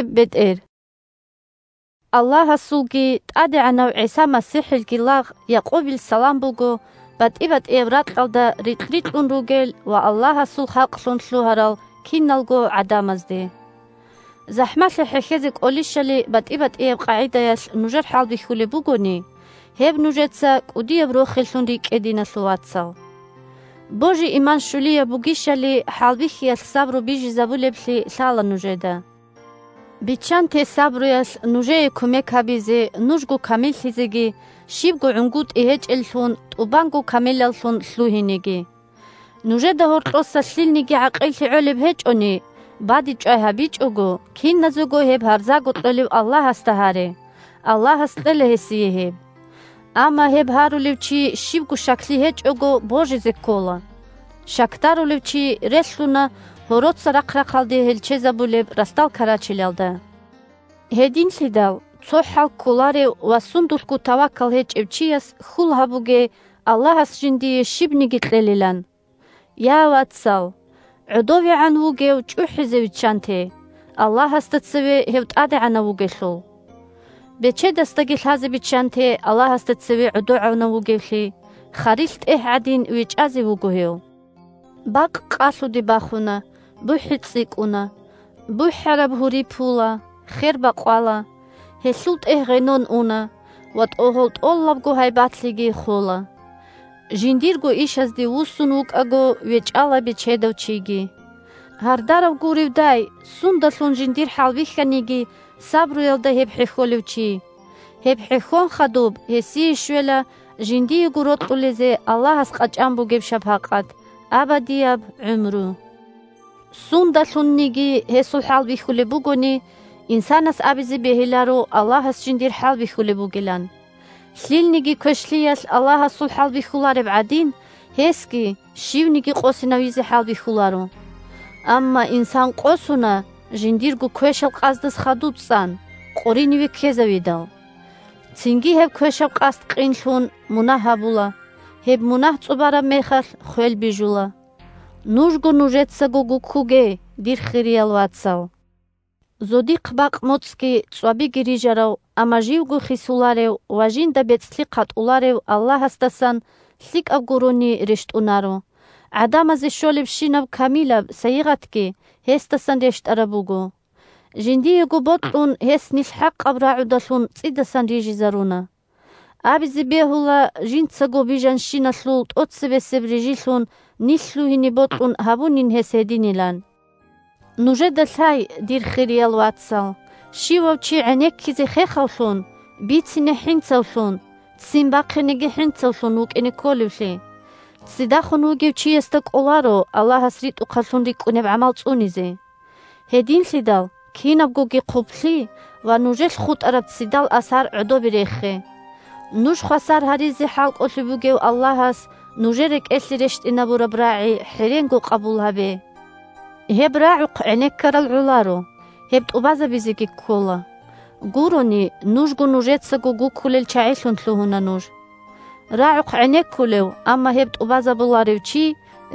бетӀер Саламалъул рагӀаби 1Аллагьасулги ТӀадегӀанав ГӀиса МасихӀилги лагъ Якъубил салам буго батӀи-батӀияб ракьалда рикь-рикьун ругел ва Аллагьасул халкълъун лъугьарал киналго гӀадамазде. ЗахӀмалъи хӀехьезе кӀолищали батӀи-батӀияб къагӀидаялъ нужер хӀалбихьулеб бугони, гьеб нужеца кӀудияб рохеллъун рикӀкӀе, диналъул вацал. Божи-иман щулияб бугищали хӀалбихьиялъ сабру бижизабулеблъи лъала нужеда. Биччанте сабруялъ нужее кумек гьабизе нужго камиллъизеги, щибго гӀунгутӀи гьечӀеллъун, тӀубанго камилаллъун лъугьинеги. Нужеда гьоркьоса лъилниги гӀакъиллъи гӀолеб гьечӀони, бадибчӀвай гьабичӀого, киназего гьеб гьарзаго кьолев Аллагьасда гьаре, Аллагьас кьела гьесие гьеб. Амма гьеб гьарулев чи, щибго щаклъи гьечӀого, божизе ккола. Щакдарулев чи релълъуна гьороца рахъ-рахъалде гьелчезабулеб ралъдал карачелалда. Гьединлъидал цо хӀал кколарев ва сундулъго тавакал гьечӀев чияс хьул гьабуге Аллагьас жиндие щибниги кьелилан. Я вацал, гӀодовегӀан вугев чӀухӀизе виччанте, Аллагьасда цеве гьев тӀадегӀанав вугелъул. Бечедасдаги лъазе биччанте Аллагьасда цеве гӀодовегӀанав вугевлъи, – харилъ тӀегь гӀадин вечӀазе вуго гьев. Бакъ къалъуде бахуна, бухӀи цӀикӀкӀуна, бухӀараб гьури пула, хер бакъвала, гьелъул тӀегь гъенон уна ва тӀогьол тӀолабго гьайбатлъиги хола. Жиндирго ишазде вуссун вукӀаго вечӀала бечедав чиги. Гьардарав гуревдай, сундалъун жиндир хӀалбихьаниги, сабруялда гьеб хӀехьолев чи. Гьеб хӀехьон хадуб гьесие щвела жиндиего рокьулезе Аллагьас къачӀан бугеб шапакъат – абадияб гӀумру. Сундалъунниги гьесул хӀалбихьулеб бугони, инсанас абизе бегьиларо Аллагьас жиндир хӀалбихьулеб бугилан. Лъилниги квешлъиялъ Аллагьасул хӀалбихьулареб гӀадин, гьесги щивниги къосинавизе хӀалбихьуларо. Амма инсан къосуна, жиндирго квешал къасдаз хадув цӀан, къориниве ккезавидал. Цинги гьеб квешаб къасд къинлъун, мунагь гьабула, гьеб мунагь цӀубараб мехалъ – хвел бижула. Нужго нужецаго гуккуге, дир хириял вацал! Зодихъ бакъ-моцӀги цӀвабиги рижарав, амма живго хисуларев ва жинда бецӀлъи хъатӀуларев Аллагьасдасан лъикӀаб гурони рещтӀунаро, гӀадамазе щолебщинаб камилаб сайигъатги гьесдасан рещтӀараб буго. Жиндиего бокьун гьес нилъ хӀакъаб рагӀудалъун цӀидасан рижизаруна. Абизе бегьула жинцаго бижанщиналъул тӀоцебесеб рижилъун нилъ лъугьине бокьун гьабунин гьес гьединилан. Нужеда лъай, дир хириял вацал, щивав чи гӀенеккизе хехавлъун, бицине хӀинцавлъун, ццин бахъинеги хӀинцавлъун вукӀине кколевлъи. Ццидахун вугев чиясда кӀоларо Аллагьас ритӀухъаблъун рикӀкӀунеб гӀамал цӀунизе. Гьединлъидал кинабгоги хъублъи ва нужелъ хутӀараб ццидал асар гӀодобе рехе. Нуж хвасар гьаризе хӀалкӀолъи бугев Аллагьас нужер рекӀелъе рещтӀинабураб рагӀи хӀеренго къабул гьабе. Гьеб рагӀухъ гӀенеккарал гӀоларо, гьеб тӀубазабизеги ккола, гурони – нужго нужецаго гуккулел чагӀилъун лъугьуна нуж. РагӀухъ гӀенеккулев, амма гьеб тӀубазабуларев чи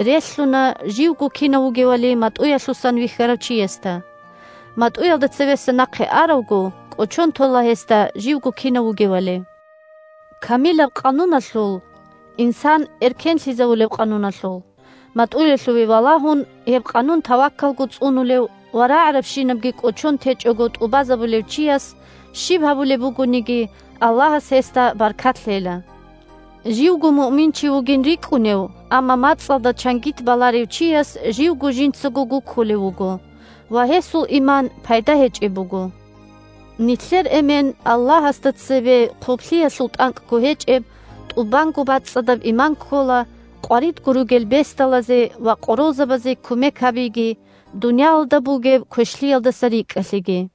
релълъуна живго кинав вугевали матӀуялъусан вихьарав чиясда. МатӀуялда цевеса нахъе аравго кӀочон тола гьесда живго кинав вугевали. Камилаб къануналъул – инсан эркенлъизавулеб къануналъул – матӀуялъуве валагьун, гьеб къанун тавакалго цӀунулев ва рагӀарабщинабги кӀочон течӀого тӀубазабулев чияс щиб гьабулеб бугониги, Аллагьас гьесда баркат лъела. Живго муъминчи вугин рикӀкӀунев, амма мацӀалда чангит баларев чияс живго жинцаго гуккулев вуго, ва гьесул иман пайда гьечӀеб буго. Нилъер Эмен Аллагьасда цебе хъублъиялъул тӀанкӀго гьечӀеб, тӀубанго бацӀцӀадаб иман ккола къваридго ругел бесдалазе ва къоролзабазе кумек гьабиги дуниялалда бугеб квешлъиялдаса рикӀкӀалъиги.